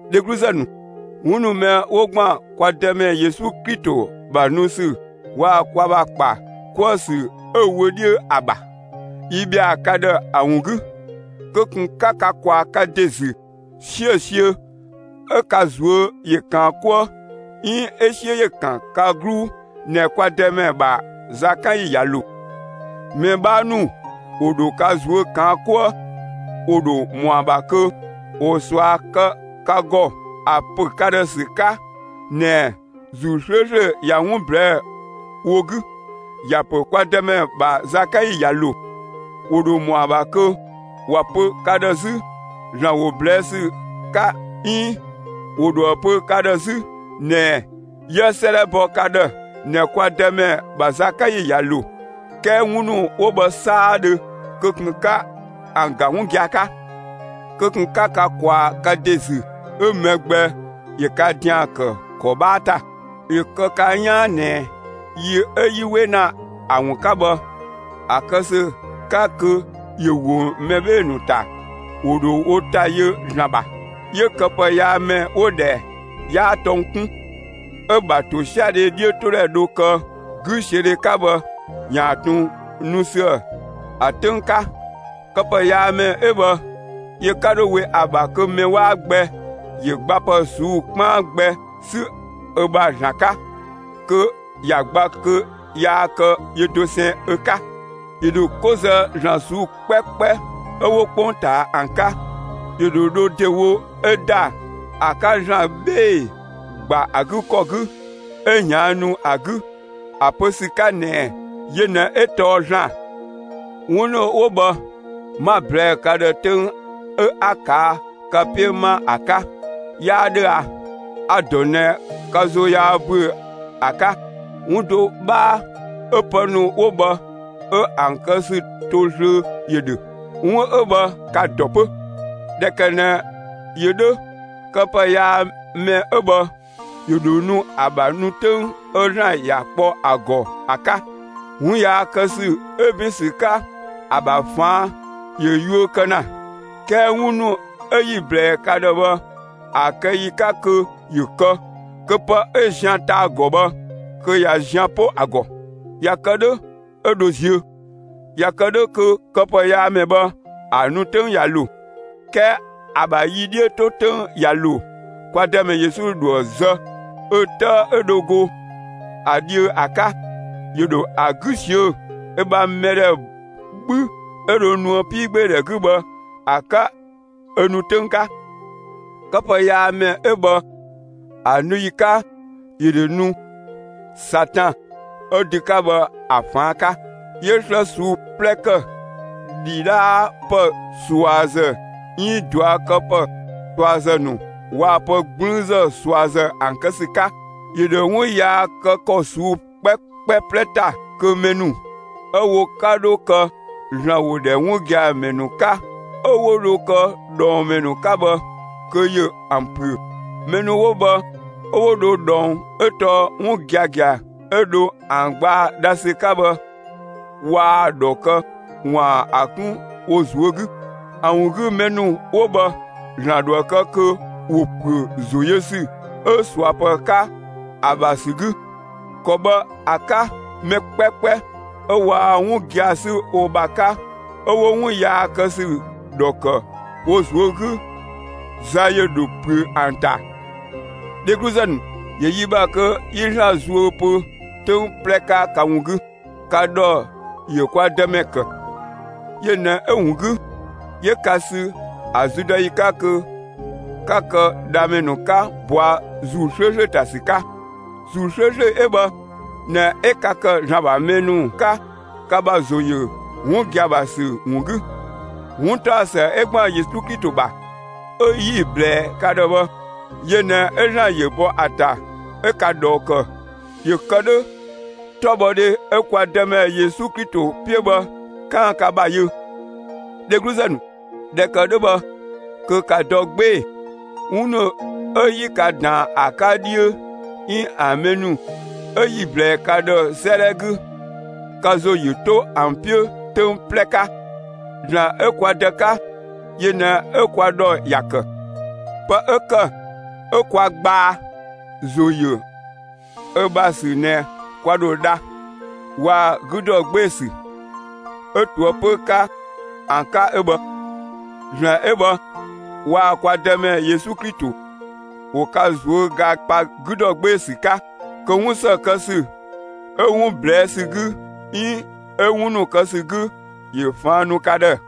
Dhegluzë ‑nu, 'wun ‑nu mɛ 'wo ‑gban kwa Dëmɛ Yesu Klito ‑bha nu ‑sü waa‑ kwa ‑bha ‑kpa 'kuë‑ ‑sü 'ö‑ wöödhö ‑a ‑bha, yi ‑bhɛa ka ‑dhë ‑a ‑wun 'gü, kö ꞊kun 'ka ka ꞊kwaa ka ‑de ‑zü 'siösiö 'ö ka ꞊zuö' ‑yö ‑kaan 'kuë 'iin 'ö 'siö ‑yö ‑kan ka 'gluu ꞊nɛ kwa Dëmɛ ‑bha zakanyi ꞊ya ‑lo. Mɛ 'bhaa ‑nu ‑wo ‑dho ka ꞊zuö' ꞊kaan' 'kuë; ‑wo ‑dho ‑mɔa ‑bha kö ‑wo ꞊sua kë ka ‑gɔ ‑a ‑pö ka ‑dhë ‑sü 'ka ꞊nɛɛ ‑Zuu 'slööslö ꞊ya 'wun ꞊blɛɛ'‑ wo 'gü; ‑ya ‑pö kwa Dëmɛ ‑bha zakanyi ꞊ya ‑lo. ‑Wo ‑dho ‑mɔa ‑bha kö ‑wa pö ka ‑dhë 'zü ‑Zlan ‑wo ꞊blɛɛ' ‑sü 'ka 'iin ‑wo ‑dhoë pö ka ‑dhë 'zü ꞊nɛɛ 'yië 'sëëdhɛ bɔ ka ‑dhë ꞊nɛ kwa Dëmɛ ‑bha zakanyi ꞊ya ‑lo. 'Kɛɛ 'wun ‑nu 'wo bhë 'saadhö kö ꞊kun 'ka ‑an ‑ga 'wun gia‑ 'ka! Kö ꞊kun 'ka ka ꞊kwaa ka ‑de ‑zü 'ö mɛ gbɛ ‑yö ka ‑dian ‑kë ‑kɔ 'bhaa ‑ta! ‑Yö kë ka 'yaan ꞊nɛ yi 'ö 'yi 'we ‑na ‑a ‑wun 'ka bhë, ‑a kë ‑sü 'ka kö ‑yö ‑wo mɛ 'bhee‑ ‑nu ‑ta, ‑wo ‑dho wo ‑ta yö ‑Zlan ‑bha. 'Yö këpëyaamɛ 'wo‑ ‑dhɛ 'yaa tɔng 'kun, 'ö‑ ‑bha ‑tosiadhe 'dhiötodhɛ dho kë 'güsiödhe 'ka bhë, ‑yaan ꞊tun nu ‑süë ‑a 'töng 'ka. Këpëyaamɛ 'ö bhë yö 'ka 'dho we ‑a ‑bha kö mɛ 'waa gbɛ ‑yö gbapë ꞊suu'‑ 'kpaan gbɛ 'sü ö ‑bha ‑Zlan 'ka kö ‑ya gba kö yaa kë yö dosɛn ö 'ka. ‑Yö ‑dho 'ko zë ‑zlan ꞊suu'‑ 'kpɛkpɛ 'ö 'wo 'kpongtaa ‑an 'ka. ‑Yö ‑dho dho ‑dewo 'ö ‑da ‑a 'ka ‑Zlan ('bhee‑) ‑gba ‑a 'gü ‑kɔ 'gü 'ö ꞊yaannu ‑a 'gü, ‑a pö ‑sü 'ka ꞊nɛɛ yö ꞊nɛ 'ö tɔɔ ‑Zlan. 'Wun ‑nu 'ö 'wo bhë 'ma‑ ꞊blɛɛ'‑ ka ‑dhë 'töng 'ö 'a ꞊kaa' ka 'piö 'ma ‑a 'ka; 'yaa 'dhö a? A‑ ‑dɔ ꞊nɛ ka ‑zo yaa ‑büö ‑a 'ka. 'Wun do 'bhaa 'ö pë ‑nu 'wo bhë 'ö ‑an kë ‑sü to zlöö ‑yö ‑dhö. 'Wun 'ö bhë ka‑ ‑dɔ 'pö. ꞊Dhɛ ‑kë ꞊nɛ ‑yö 'dhö, këpëyaamɛ 'ö bhë ‑yö ‑dho nu ‑a ‑bha nu 'töng 'ö ‑Zlan ‑ya kpɔ ‑a ‑gɔ ‑a 'ka. 'Wun yaa kë ‑sü 'ö ‑bin ‑sü 'ka ‑a ‑bha ꞊faan' ‑yö yuö kë ‑na; 'kɛɛ 'wun ‑nu 'ö 'yi‑ ꞊blɛɛ ka ‑dhë bhë ‑a kë ‑yi 'ka kö ‑yö kë, kö pë 'ö zian ta‑ ‑gɔ bhë kö ꞊ya zian 'po ‑a ‑gɔ. ꞊Ya kë 'dhö 'ö dho ziö. ꞊Ya kë 'dhö kö këpëyaamɛ bhë ‑a nu 'töng ꞊ya ‑lo. 'Kɛɛ ‑a ‑bha yi 'dhiö 'to 'töng ꞊ya ‑lo, kwa Dëmɛ Yesu ‑dhoë zë ö 'tëë 'ö dho go ‑a dhiö ‑a 'ka; ‑yö ‑dho ‑a 'gü ꞊siö'‑ ö ‑bha mɛdhɛ 'bhü 'ö dho nuë 'piigbeedhɛ 'gü bhë ‑a 'ka ö nu 'töng 'ka. Këpëyaamɛ 'ö bhë ‑a nu ‑yi 'ka, ‑yö ‑dho nu Satan ('ö dü 'ka bhë ‑a) ꞊faan' 'ka; 'yö 'slë ꞊suu'‑ 'plɛ ‑kë, ‑dhidhaapë ꞊suazë 'iin ꞊duakëpë ꞊suazë ‑nu waa‑ pë 'gblüünzë ꞊suazë ‑an kë ‑sü 'ka. ‑Yö ‑dho 'wun yaa kë ‑kɔ ꞊suu'‑ 'kpɛkpɛ 'plɛ ‑ta kö mɛ ‑nu ('ö wo 'ka 'dho kë ‑Zlan ‑wo ‑dhɛ 'wun gia‑ ‑mɛ ‑nu 'ka) 'ö 'wo dho kë dhɔng ‑mɛ ‑nu 'ka bhë, kö ‑yö ‑an ‑püö. Mɛ ‑nu 'wo bhë 'ö 'wo dho ꞊dhɔng 'ö tɔɔ 'wun giagia 'ö dho ‑an gbaa dha ‑sü 'ka bhë waa‑ ‑dhɔ kë ‑waan ‑a 'kun wo ꞊zuö' 'gü. ‑A ‑wun 'gü mɛ ‑nu 'wo bhë ‑Zlan ‑dhoë kë kö ‑wo ‑püö ‑zo yö ‑sü 'ö ꞊suapë 'ka ‑a ‑bha ‑sü 'gü. ‑Kɔ bhë ‑a 'ka mɛ 'kpɛkpɛ 'ö waa 'wun gia‑ 'sü wo ‑bha 'ka 'ö 'wo 'wun yaa kë ‑sü ‑dhɔ ‑kë wo ꞊zuö' 'gü, za ‑yö ‑dho ‑püö ‑an ‑ta. Dhegluzë ‑nu, ‑yö yi ‑bha kö 'yi ‑Zlan zuö pö 'töng 'plɛ 'ka ka ‑wun 'gü. Ka ‑dhɔ ‑yö kwa Dëmɛ ‑kë. Yö ꞊nɛ 'ö‑ ‑wun 'gü, 'yö ka sü ‑a züdɔyi 'ka kö 'ka kë dhamɛ ‑nu 'ka ꞊bɔa' ‑Zuu 'slööslö ‑ta ‑sü 'ka. ‑Zuu 'slööslö 'ö bhë ꞊nɛ 'ö ka ‑kë ‑Zlan ‑bha mɛ ‑nu 'ka ka ‑bha ‑zo ‑yö 'wun gia‑ ‑bha ‑sü ‑wun 'gü. 'Wuntaɔsë ('ö ‑gban Yesu Klito ‑bha) 'ö 'yi‑ ꞊blɛɛ ka ‑dhë bhë, yö ꞊nɛ 'ö ‑Zlan ‑yö bɔ ‑a ‑ta, 'ö ka ꞊dhɔɔ kë ‑yö ‑kë 'dhö 'tɔbhɔdhe 'ö kwa Dëmɛ Yesu Klito 'piö bhë 'kaan‑ ka ‑bha yö. Dhegluzë ‑nu, ꞊dhɛ ‑kë 'dhö bhë, kö ‑ka dɔ 'gbee‑! 'Wun ‑nu 'ö 'yi ka ‑daan ‑a 'ka dhiö 'iin ‑a mɛ ‑nu 'ö 'yi‑ ꞊blɛɛ ka ‑dhë 'sëëdhɛ 'gü, ka ‑zo ‑yö 'to ‑an 'piö 'töng 'plɛ 'ka! ‑Zlan 'ö kwa Dë 'ka yö ꞊nɛ 'ö kwa ‑dhɔ ‑ya ‑kë; pë 'ö ‑kë 'ö kwa gbaa ‑zo ‑yö ö ‑bha ‑sü ꞊nɛ kwa ‑dho dha, waa‑ 'gü ‑dɔ 'gbee‑ ‑sü, 'ö ꞊toëpö 'ka ‑an 'ka 'ö bhë. ‑Zlan 'ö bhë waa‑ kwa Dëmɛ Yesu Klito ‑wo ka ꞊zuöga pa 'gü ‑dɔ 'gbee‑ ‑sü 'ka. Kö 'wun ‑së kë ‑sü 'ö 'wun ꞊blɛɛ' ‑sü 'gü 'iin 'ö 'wun ‑nu kë ‑sü 'gü ‑yö ꞊faan' nu ka ‑dhë.